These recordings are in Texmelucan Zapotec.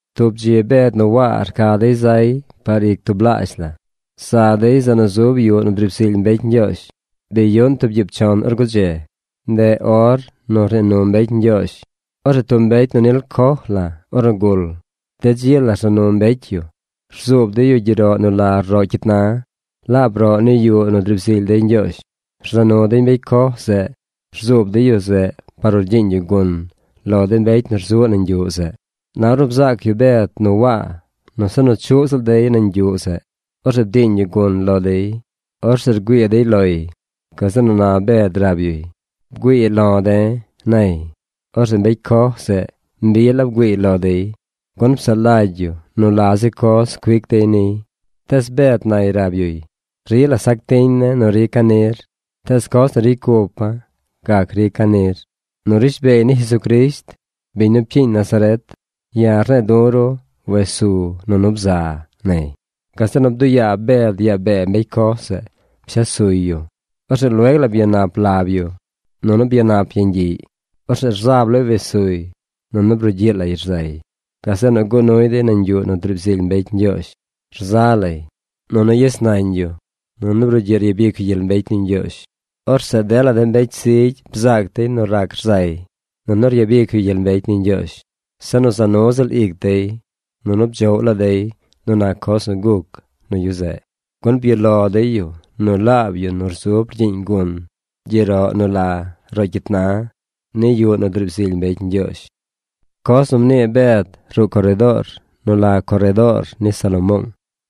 Tub dzi Bed nu Waa rca dey zay par ic tublaazh la. Za dey zeꞌ nu zub yuꞌ nu driib zily mbecy Ñgyoozh. Bi yuꞌn tub gyiib chon or gudze. Ndeꞌ or nu rnii nu mbecy Ñgyoozh. Orzeꞌ tub mbecy nu nil coj la ornu gul, de dzi la rza nu mbecy yu. Rzuub dey yu gyeroꞌ nu la Roꞌ Cyit Na. Laab roꞌ ni yuꞌ nu driib zily dey Ñgyoozh. Rza nu dey mbecy coj zeꞌ rzuub dey yu zeꞌ par nu rgyiiñ yu gun lo de mbecy nu rzuꞌ nañ yuꞌ zeꞌ. Na ornu bzaac yu Bed nu Waa nu se nu chuꞌ ziꞌl dey nañ yuꞌ zeꞌ, orzeꞌ bdiiñ yu gun lo dey. Orzeꞌ rgüii dey loy. Gazeꞌ nu na Bed rab yuy: ―Bgüii lo̱ de̱ ―nay. Orzeꞌ mbecy coj zeꞌ mbi la bgüiiy lo dey, gun psaꞌ lagy yu nu la zi coz cuic dey niy. Tees Bed nay rab yuy: ―Rila sac tiñ ne̱ nu rica̱ nir, tees coz nu ricy cupa̱ gac rica̱ nir. Nu rishbeey ni Jesucrisht, biñ nu pcyiiñ Nazaret, ya̱ rne̱e̱ du̱ ru wes su nunu bza ―nay. Gazeꞌ nu bduꞌ yaa Bed yaa bee mbecy coj zeꞌ pshes suy yu. Orzeꞌ lueg la byanap lab yu, nunu byanap yeñ gyiꞌy. Orzeꞌ rzab lay wes suy, nunu brugyiꞌ lay rzay. Gazeꞌ nu guꞌ nuy dey nañ yuꞌ nu driib zily mbecy Ñgyoozh. Rza lay, nunu yes nañ yu, nunu brugyiꞌ ryabic yu gyel mbecy ni Ñgyoozh. Orzeꞌ dela de mbecy zigy bzaac dey nu rac rzay, nunu ryabic yu gyel mbecy ni Ñgyoozh. Se nu za nu ziꞌl ic dey, nunu bdzoꞌw laa dey nu nac coz nu guc nu yu zeꞌ, gun byuꞌ lo dey yu nu laab yu nu rzub rgyiiñ gun gyeroꞌ nu la Roꞌ Cyit Na ni yuꞌ nu driib zily mbecy Ñgyoozh. Coz nu mnii Bed ruꞌ coredoor nu la “Coredoor ni Salomoong”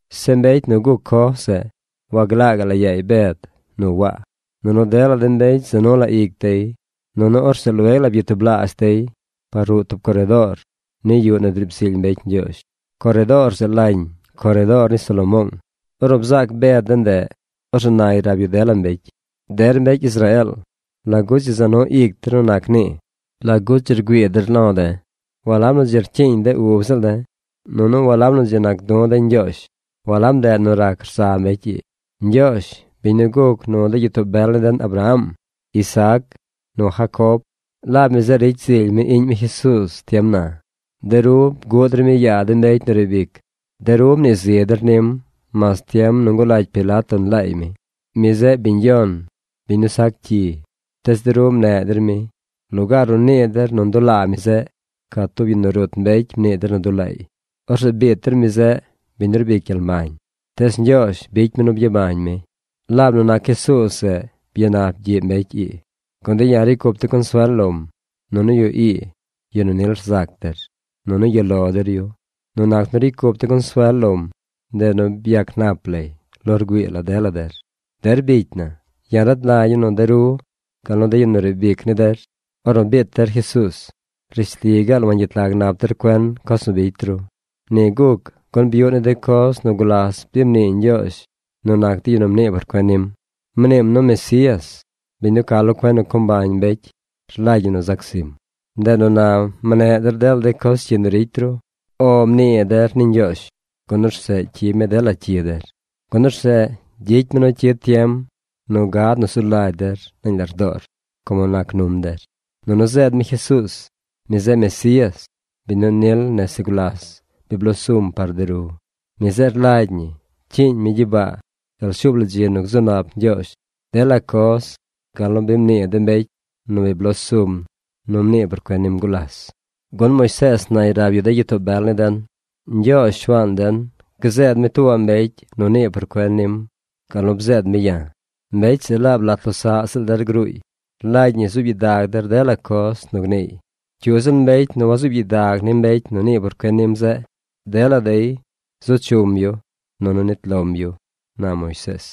Zeꞌ mbecy nu guc coj zeꞌ waglaa gaꞌ la yaay Bed nu Waa. Nunu dela de mbecy za nu la ic dey. Nunu orzeꞌ lueg la byatublaazh dey par ruꞌ tub coredoor ni yuꞌ nu driib zily mbecy Ñgyoozh. Coredoor zeꞌ lañ Coredoor ni Salomoong. Ornu bzaac Bed de ndeꞌ, orzeꞌ nay rab yu dela mbecy: ―Der mbecy Israeel, ¿lagu dzi za nu ic der nu nac nii? ¿Lagu dzi rgüii der lo̱ de̱? Walab nu dzi rcyiiñ de ub ziꞌl de̱, nunu walab nu dzi nac du̱ de̱ Ñgyoozh, walab ndeꞌ nu rac rza mbecy ii. Ñgyoozh, biñ nu guc nu de gyitoo bel ni den, Abraham, Isaac nu Jacob, laab mi zeꞌ ricy zily mi Iꞌñ mi Jesuuz tiem na. De ru bguꞌ der mi yaa de mbecy nu riib ic. De ru mnii zi der nim mas tiem nu ngulagy Pilato nlaay mi. Mi zeꞌ biñ yon, biñ nu sac cyi, tees de ru mneꞌ der mi. Lugaar nu nii der nu ndulaa mi zeꞌ, ca tub yu nu rut mbecy mnii der nu dulaay. Orzeꞌ biit der mi zeꞌ, biñ nu rbic gyel mbañ. Tees Ñgyoozh bicy mi nu byabañ mi. Laab nu nac Jesuuz zeꞌ, byanap gyiꞌ mbecy ii, gun de̱ ya̱ ricy cup de̱ consuel lom. Nunu yu ii, yu nu nil rzac der, nunu yuꞌ lo der yu. Nu nac nu ricy cup de̱ consuel lom, ndeꞌ nu byac nap lay lo rgüii la dela der. ’Der bicy na, ya̱ rad lagya̱ nu de ru gal nu de yu nu riib ic ni der, ornu biit der Jesuuz, rishli gaal wangyet lag nap der cuen coz nu bicy ru. Ni guc gun byuꞌ ni de coz nu gulas bi mnii Ñgyoozh nu nac de yu nu mnii por cuen nim. Mniim nu Mesías, biñ nu ca lo cuen nu co mbañ mbecy rlagy ñi nu zac zim. Ndeꞌ nu na mneꞌ der dela de coz cyi nu ricy ru. “O” mnii der ni Ñgyoozh, gun orzeꞌ cyib mi dela cyi der. Gun orzeꞌ gyicy mi nu cyid tiem nu gad nu zu lagy der nañ lardoor como nac num der. Nunu zeed mi Jesuuz. Mi zeꞌ Mesías, biñ nu nil nese gulas bi bloo sum par de ru. Mi zeꞌ rlagy ñi cyiiñ mi gyibaa gal shuub la dzi nu gzu nap Ñgyoozh dela coz gal nu bi mnii de mbecy nu bloo sum nu mnii por cuen nim gulas. Gun Moisees nay rab yu de gyitoo bel ni den: “Ñgyoozh, Shuaan den, gzeed mi tuubaꞌ mbecy nu nii por cuen nim gal nu bzeed mi ya̱. Mbecy zeꞌ laab lat losaꞌ ziꞌl der gruuy. Rlagy ñi zuub gyidag der dela coz nu gniiy. Cyu ziꞌl mbecy nu wazuub gyidag ni mbecy nu nii por cuen nim zeꞌ, dela dey zu chum yu, nunu nit lom yu”, na Moisees.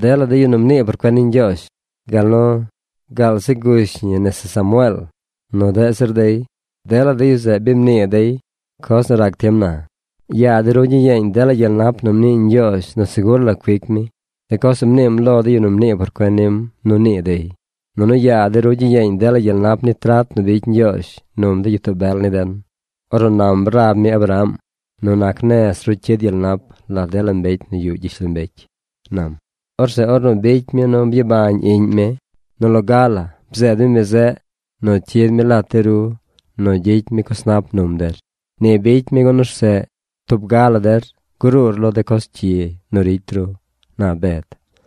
’Dela de yu nu mnii por cuen ni Ñgyoozh, gaal zi gush ñi nese Samueel, nu deꞌ zir dey, dela de yu zeꞌ bi mnii dey coz nu rac tiem na. Yaa de ru gyiyeeñ dela gyel nap nu mnii Ñgyoozh nu segur la cuic mi: de coz nu mniim lo de yu nu mnii por cuen nim nu nii dey. Nunu yaa de ru gyiyeeñ dela gyel nap ni trat nu bicy Ñgyoozh num de gyitoo bel ni den, ornu nam rab mi Abraham: “Nu nac nez ru cyid gyel nap lat dela mbecy nu yuꞌ gyishlombecy”, nam. Orzeꞌ ornu bicy mi nu byabañ Iꞌñ mi, nu loga la bzeed mi mi zeꞌ nu cyid mi lat de ru nu gyicy mi coz nap num der. Ni bicy mi gun orzeꞌ tub ga la der gruur lo de coz cyi nu ricy ru ―na Bed.